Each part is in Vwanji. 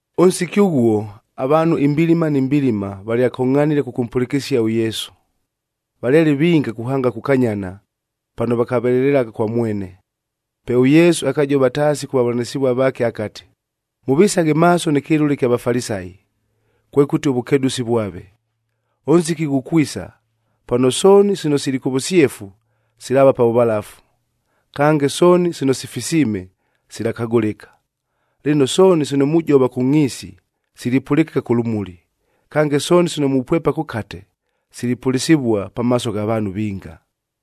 Ʉnsiki ʉghuo, avaanhu imbilima ni mbilima valyakongʼhanile kʉkʉmpʉlɨkɨsia ʉYesu. Valyale vinga kuhanga kukanyana, pano vakavelelelagha kwa mwene. Pe ʉYesu akajova taasi kʉ vavʉlanɨsɨvua vaake akati, “Mʉvisaghe maaso nɨ kɨlʉlea ɨkya Vafalisayi, kwekʉti ʉvʉkedʉsi vwave. Ʉnsiki ghukwisa, pano sooni sino sili kʉ vʉsyefu, silaava pa vʉvalafu; kange sooni sino sifisiime, silakagʉlɨka. Lɨno, sooni sino mujova kʉ ngʼhiisi, silipʉlɨkɨka kʉ lʉmuli. Kange, sooni sino mupwepa kʉkate, silipʉlɨsɨvua pamaaso gha vaanhu vinga.”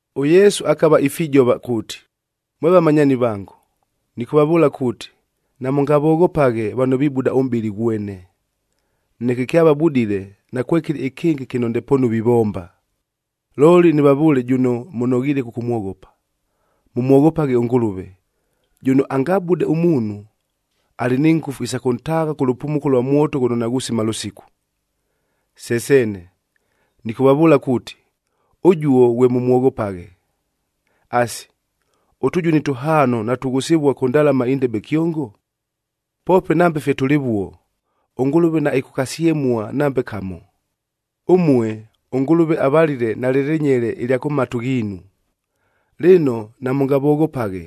ɄYesu akava ifijova kuuti, “Mwe vamanyaani vango, nɨkʉvavʉʉla kuuti, namʉngavoghopaghe vano vibuda ʉmʼbɨlɨ ghwene. Neke kyavabudile, nakwekɨlɨ ɨkɨngɨ kɨno ndepoonu vivomba. Looli, nɨvavʉʉle jʉno mʉnoghiile kʉkʉmwoghopa, mʉmwoghopaghe ʉNgʉlʉve, jʉno angabude ʉmuunhu, alɨ ni ngʉfu isa kʉntaagha kʉ lʉpumuko lwa mwoto ghʉno naghusima lʉsiku. Se seene! Nɨkʉvavʉʉla kuuti, ʉjuo ghwe mʉmwoghopaghe! “Asi, ʉtʉjuni tʉhaano natughʉsɨvua kʉ ndalama indebe kyongo? Poope nambe fye tʉlɨvuo, ʉNgʉlʉve naɨkʉkasyemua nambe kamo. Ʉmue, ʉNgʉlʉve avalile nalɨ lɨnyele ɨlya kʉ matu ghiinu. Lɨno, namʉngavoghopaghe,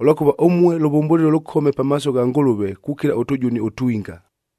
ʉlwakʉva ʉmue lʉvʉmbʉlɨlo lʉkome pamaaso gha Ngʉlʉve kukila ʉtʉjuni ʉtwinga.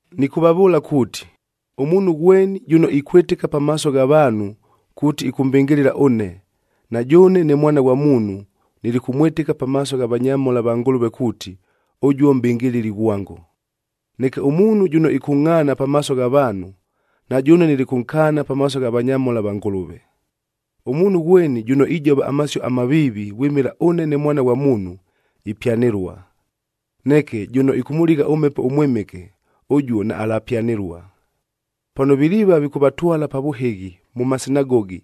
“Nɨkʉvavʉʉla kuuti, ʉmuunhu ghweni jʉno ikwɨtɨka pamaaso gha vaanhu kuuti ɨkʉmbɨngɨlɨla ʉne, na jʉʉne ne Mwana ghwa Muunhu, nilikʉmwɨtɨka pamaaso gha vanyamhola va Ngʉlʉve kuuti, ʉjuo mʼbɨngɨlɨli ghwango. Neke ʉmuunhu jʉno ɨkʉngʼhaana pamaaso gha vaanhu, na jʉʉne nilikʉnkaana pamaaso gha vanyamhola va Ngʉlʉve. Ʉmuunhu ghweni jʉno ijova amasio amaviivi vwɨmɨla ʉne ne Mwana ghwa Muunhu, ipyanɨlua. Neke, jʉno ɨkʉmʉligha ʉMhepo ʉMwɨmɨke, ʉjuo naalapyanɨlua. “Pano viliiva vikʉvatwala pa vʉhɨghi mʉ masinagogi,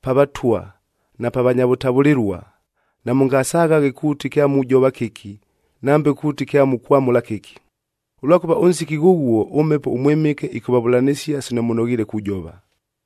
pa vatwa na pa vanya vʉtavʉlɨlua, namʉngasaghaghe kuuti kyamujova kɨki nambe kuuti kyamukwamʉla kɨki. Ʉlwakʉva ʉnsiki ghʉghuo ʉMhepo ʉMwɨmɨke ɨkʉvavʉlanɨsia sino mʉnoghiile kujova.”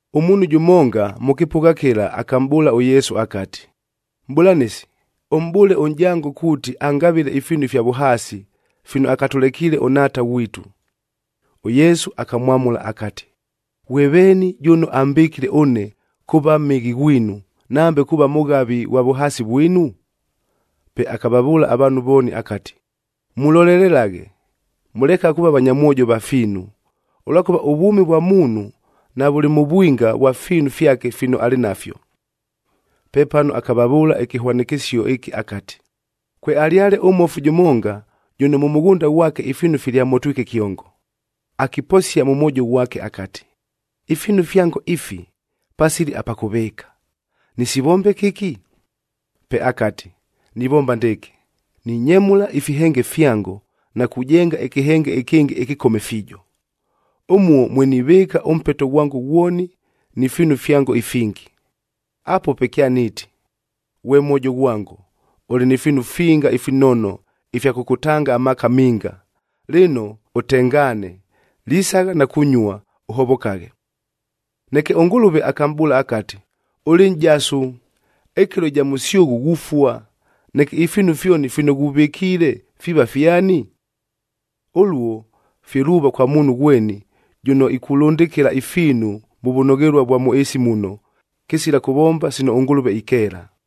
Ʉmuunhu jʉmonga mʉ kɨpʉgha kɨla akamʼbʉʉla ʉYesu akati, “Mʼbʉlanɨsi, ʉmʼbʉʉle ʉnʼjango kuuti angavɨle ifiinu ifya vʉhaasi, fino akatʉlekiile ʉnhaata ghwitu.” ɄYesu akamwamʉla akati, “Ghwe veeni jʉno ambɨkile ʉne, kuuva mhɨghi ghwinu, nambe kuuva mʉghavi ghwa vʉhaasi vwinu?” Pe akavavʉʉla avaanhu vooni akati, “Mulolelelaghe! Mʉlekaghe kuuva vanyamwojo va fiinu, ʉlwakʉva ʉvwʉmi vwa muunhu navʉlɨ mʉ vwinga vwa fiinu fyake fino alɨ nafyo.” Pepano akavavʉʉla ɨkɨhwanɨkɨsio ɨkɨ akati, “Kwealyale ʉmmofu jʉmonga, jʉno mʉ mʉghʉnda ghwake ifiinu filyamotwike kyongo. Akiposia mʉ mwojo ghwake akati, ‘Ifiinu fyango ifi, pasili apa kʉvɨɨka! Nɨsivombe kɨki?’ Pe akati, ‘Nivomba ndɨɨkɨ: Ninyemʉla ifihenge fyango, na kujenga ɨkɨhenge ɨkɨngɨ ɨkɨkome fiijo. Ʉmuo mwe nivɨɨka ʉmpeto ghwango ghwoni ni fiinu fyango ifingi. Apuo pe kyaniiti, “Ghwe mwojo ghwango, ʉlɨ ni fiinu finga ifinono ifya kʉkʉtanga amaaka minga. Lɨno, ʉtengaane, lisagha na kunyua, ʉhovokaghe.” ’ Neke ʉNgʉlʉve akamʼbʉʉla akati, ‘Ʉlɨ nʼjasu! Ɨkɨlo ɨja mʉsyʉghʉ ghufua! Neke ifiinu fyoni fino ghuvɨkiile, fiiva fyani?’ “Ʉluo fye luuva kwa muunhu ghweni, jʉno ikulʉndɨkɨla ifiinu mʉ vʉnoghelua vwa mʉ ɨɨsi muno, kɨsila kʉvomba sino ʉNgʉlʉve ikeela.”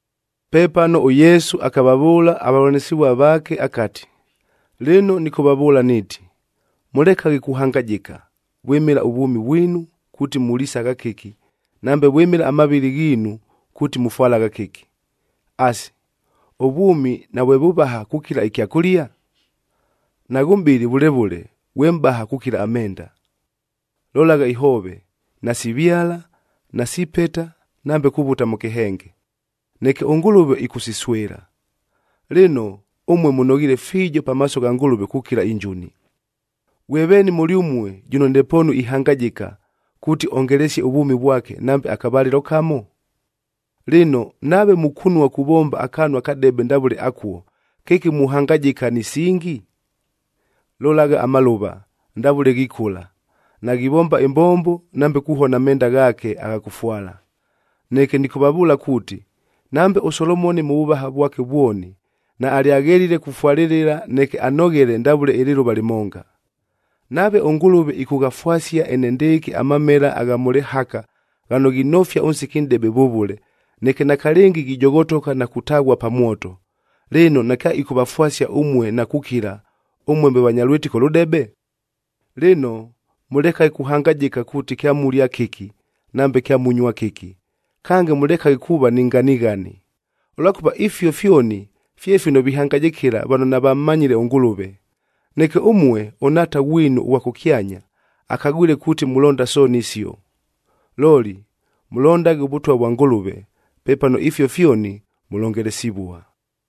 Pepano ʉYesu akavavʉʉla avavʉlanɨsɨvua vaake akati, “Lɨno nɨkʉvavʉʉla niiti, mʉlekaghe kuhangajɨka, vwɨmɨla ʉvwʉmi vwinu kuuti mulisagha kɨki, nambe vwɨmɨla amavɨlɨ ghiinu kuuti mufwalagha kɨki. Asi, ʉvwʉmi navwe vʉvaha kukila ɨkyakʉlia? Naghʉ mʼbɨlɨ vʉle vʉle, ghwe mʼbaha kukila amenda! Lolagha ihoove, nasivyala, nasipeta nambe kuvuta mʉ kɨhenge. Neke ʉNgʉlʉve ɨkʉsiswɨla. Lɨno, ʉmue mʉnoghiile fiijo pamaaso gha Ngʉlʉve kukila injuni! “Ghwe veeni mʉlyʉmue jʉno ndepoonu ihangajɨka, kuuti ongelesie ʉvwʉmi vwake nambe akavalɨlo kamo? Lɨno, nave mukunua kuvomba akaanu akadebe ndavʉle akuo, kɨki muhangajɨka ni singi? “Lolagha amalʉva, ndavʉle ghikʉla. Naghivomba ɨmbombo nambe kuhona amenda ghaake agha kʉfwala. Neke nɨkʉvavʉʉla kuuti, nambe ʉSolomoni mʉ vʉvaha vwake vwoni, naalyaghelile kufwalɨlɨla neke anoghele ndavʉle ɨlɨlʉva lɨmonga! Nave ʉNgʉlʉve ɨkʉghafwasia enendɨɨkɨ amamela agha mʉ lɨhaka ghano ghinofia ʉnsiki nʼdebe vʉvʉle, neke nakalɨngi ghijoghotoka na kutaghua pa mwoto, lɨno nakyaɨkʉvafwasia ʉmue na kukila, ʉmue mwe vanya lwɨtɨko lʉdebe? “Lɨno, mʉlekaghe kuhangajɨka kuuti kyamulia kɨki, nambe kyamunyua kɨki, kange mʉlekaghe kuuva ni nganighani, ʉlwakʉva ifio fyoni fye fino vihangajɨkɨla vano navammanyile ʉNgʉlʉve. Neke ʉmue ʉNhaata ghwinu ʉghwa kʉkyanya akagwile kuuti mulonda sooni isio! Looli, mʉlondaghe ʉVʉtwa vwa Ngʉlʉve, pepano ifio fyoni mʉlongelesivua.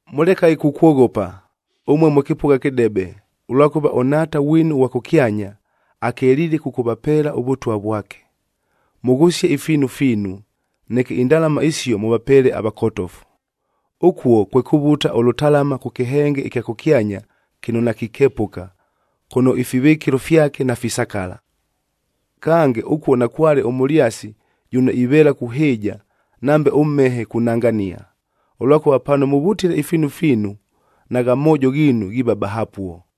“Mʉlekaghe kukwoghopa, ʉmue mwe kɨpʉgha kɨdebe, ʉlwakʉva ʉNhaata ghwinu ʉghwa kʉkyanya, akeliile kʉkʉvapeela ʉVʉtwa vwake. Mʉghʉsie ifiinu fiinu, neke indalama isio mʉvapeele avakotofu. Ʉkuo kwe kuvuta ʉlʉtalama kʉ kɨhenge ɨkya kʉkyanya kɨno nakikepʉka, kʉno ifivɨkɨlo fyake nafisakala. Kange, ʉkuo nakwale ʉmʉlyasi jʉno iveela kuhɨɨja nambe ʉmhehe kunangania. Ʉlwakʉva pano mʉvutile ifiinu fiinu, nagha moojo ghiinu ghiiva bahapuo.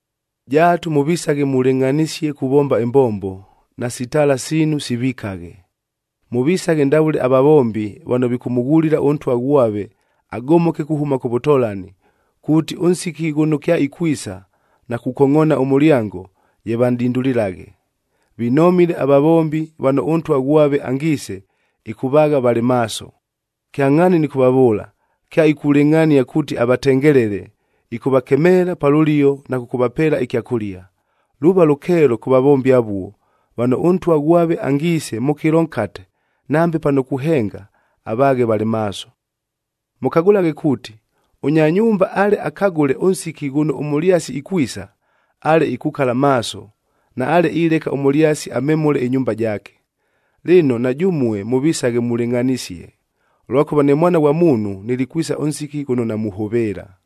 “Jaatu mʉvisaghe mulɨngʼhanisie kuvomba ɨmbombo, nasi taala siinu sivikaghe. Mʉvisaghe ndavʉle avavombi vano vikʉmʉghulila ʉntwa ghwave agomoke kuhʉma kʉ vʉtolani, kuuti ʉnsiki ghʉno kyaikwisa na kukongʼoona ʉmʉlyango, ye vanʼdindulilaghe. Vinomile avavombi vano ʉntwa ghwave angiise, ɨkʉvaagha valɨ maaso. Kyangʼhaani nɨkʉvavʉʉla, kyaikulɨngʼhania kuuti avatengelele, ɨkʉvakemeela pa lʉlio na kʉkʉvapeela ɨkyakʉlia. Luuva lʉkeelo kʉ vavombi avuo, vano ʉntwa ghwave angiise mʉ kɨlo nkate, nambe pano kuhenga, avaaghe valɨ maaso. “Mʉkagʉlaghe kuuti, ʉnya nyumba ale akagʉle ʉnsiki ghʉno ʉmʉlyasi ikwisa, ale ikukala maaso, naale ileka ʉmʉlyasi amemʉle ɨnyumba jaake. Lɨno, na jʉmue mʉvisaghe mulɨngʼhanisie! Ʉlwakʉva ne Mwana ghwa Muunhu, nilikwisa ʉnsiki ghʉno namuhʉvɨɨla.”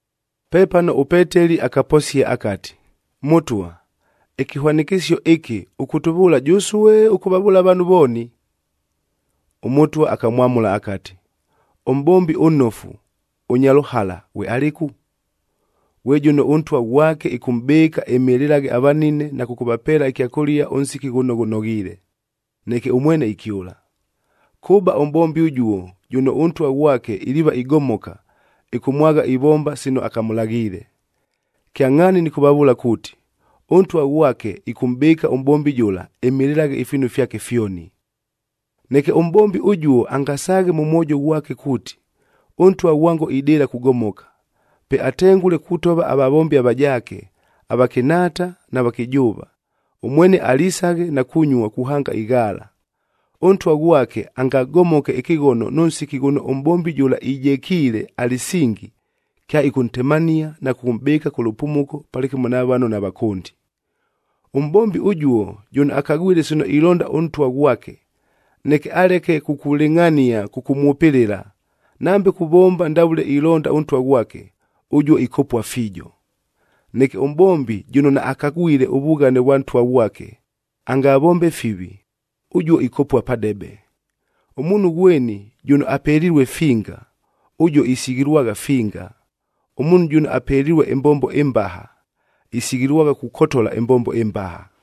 Pepano ʉPeteli akaposia akati, “Mʉtwa, ɨkɨhwanɨkɨsio ɨkɨ ʉkʉtʉvʉʉla jʉsue, ʉkʉvavʉʉla avaanhu vooni?” ɄMʉtwa akamwamʉla akati, “Ʉmʼbombi ʉnnofu, ʉnya lʉhala, ghwe alɨku? Ghwe jʉno ʉntwa ghwake ɨkʉmʼbɨɨka ɨmɨlɨlaghe avanine na kʉkʉvapeela ɨkyakʉlia ʉnsiki ghʉno ghʉnoghiile, neke ʉmwene ikyʉla. Kʉba ʉmʼbombi ʉjuo jʉno ʉntwa ghwake iliiva igomoka, ɨkʉmwagha ivomba sino akamʉlaghiile. Kyangʼhaani nɨkʉvavʉʉla kuuti, ʉntwa ghwake ɨkʉmʼbɨɨka ʉmʼbombi jʉla, ɨmɨlɨlaghe ifiinu fyake fyoni. “Neke ʉmʼbombi ʉjuo angasaaghe mʉ mwojo ghwake kuuti, ‘Ʉntwa ghwango idɨɨla kugomoka.’ Pe atengʉle kutova avavombi avajaake, avakɨnhaata na vakɨjʉʉva, ʉmwene alisaghe na kunyua kuhanga ighaala. Ʉntwa ghwake, angagomoke ɨkɨghono nʉ nsiki ghʉno ʉmʼbombi jʉla ijekiile alɨsingi, kyaɨkʉntemania na kʉkʉmʼbɨɨka kʉ lʉpumuko palɨkɨmo na vano navakʉndi. “Ʉmʼbombi ʉjuo jʉno akagwile sino ilonda ʉntwa ghwake, neke aleke kukulɨngʼhania kʉkʉmwʉpɨlɨla, nambe kuvomba ndavʉle ilonda ʉntwa ghwake, ʉjuo ikopua fiijo. Neke ʉmʼbombi jʉno naakagwile ʉvughane vwa ntwa ghwake, angavombe fivi, ʉjuo ikopua padebe. Ʉmuunhu ghweni jʉno apelilue finga, ʉjuo isighilwagha finga. Ʉmuunhu jʉno apelilue ɨmbombo ɨmbaha, isighilwagha kukotola ɨmbombo ɨmbaha.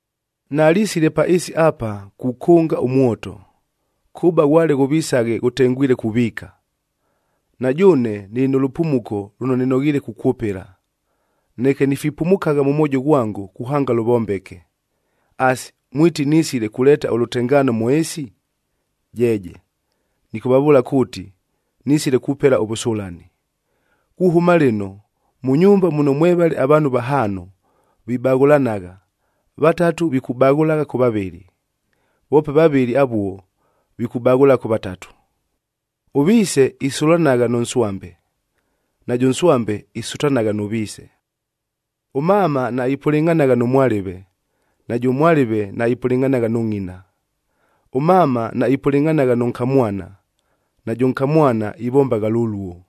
“Nalisile pa ɨɨsi apa, kukʉnga ʉmwoto. Kʉba ghwale ghʉvisaghe ghʉtengwile kuviika! Na jʉʉne nɨlɨ nʉ lʉpumuko lʉno nɨnoghiile kukwʉpɨla, neke nifipumukagha mʉ mwojo ghwango, kuhanga lʉvombeke. Asi, mwiti nisile kuleeta ʉlʉtengaano mʉ ɨɨsi? Jeeje! Nɨkʉvavʉʉla kuuti, nisile kupela ʉvʉsʉlani. Kuhʉma lɨno, mʉ nyumba muno mwevale avaanhu vahaano, vibaghʉlanagha, vatatu vikubaghʉla kʉ vavɨlɨ. Voope vavɨlɨ avuo, vikubaghʉlagha kʉ vatatu. Ʉviise isʉlanagha nʉ nswambe, najʉ nswambe isʉtanagha nʉ viise. Ʉmama naipʉlɨngʼhanagha nʉ mwalɨve, najʉ mwalɨve naipʉlɨngʼhanagha nʉ ngʼina. Ʉmama naipʉlɨngʼhanagha nʉ nkamwana, najʉ nkamwana ivombagha lʉluo.”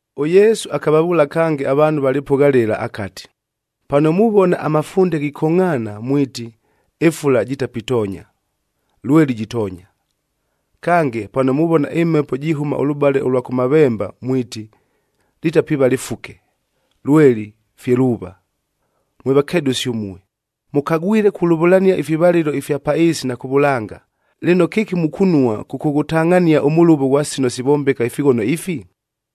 ɄYesu akavavʉʉla kange avaanhu va lɨpʉgha lɨla akati, “Pano muvona amafunde ghikongʼhaana mwiti, ‘Ɨfula jitapitonya,’ lweli jitoonya. Kange, pano muvona ɨmhepo jihʉma ʉlʉbale ʉlwa kʉmavemba mwiti, ‘Litapiiva lɨfuke,’b lweli fye luuva. Mwe vakedʉsi ʉmue, mʉkagwile kulʉvʉlania ifivalɨlo ifya pa ɨɨsi na kʉ vʉlanga! Lɨno, kɨki mukunua kʉkʉghʉtangʼhania ʉmʉlʉvo ghwa sino sivombeka ifighono ifi?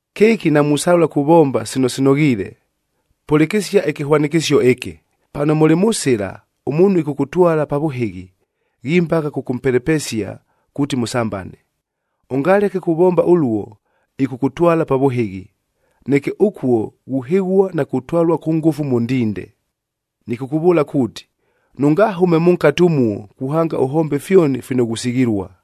“Kɨki namusalʉla kuvomba sino sinoghiile? Pʉlɨkɨsia ɨkɨhwanɨkɨsio ɨkɨ, pano mʉlɨ mʉ sɨla ʉmuunhu ɨkʉkʉtwala pa vʉhɨghi, ghimbagha kʉkʉmpelepesia kuuti mʉsambane. Ʉngaleke kuvomba ʉluo, ɨkʉkʉtwala pa vʉhɨghi, neke ʉkuo ghuhɨghua na kutwalua kʉ ngʉfu mʉ ndinde. Nɨkʉkʉvʉʉla kuuti, nʉngahʉme mʉnkate ʉmuo kuhanga ʉhombe fyoni fino ghusighilua!”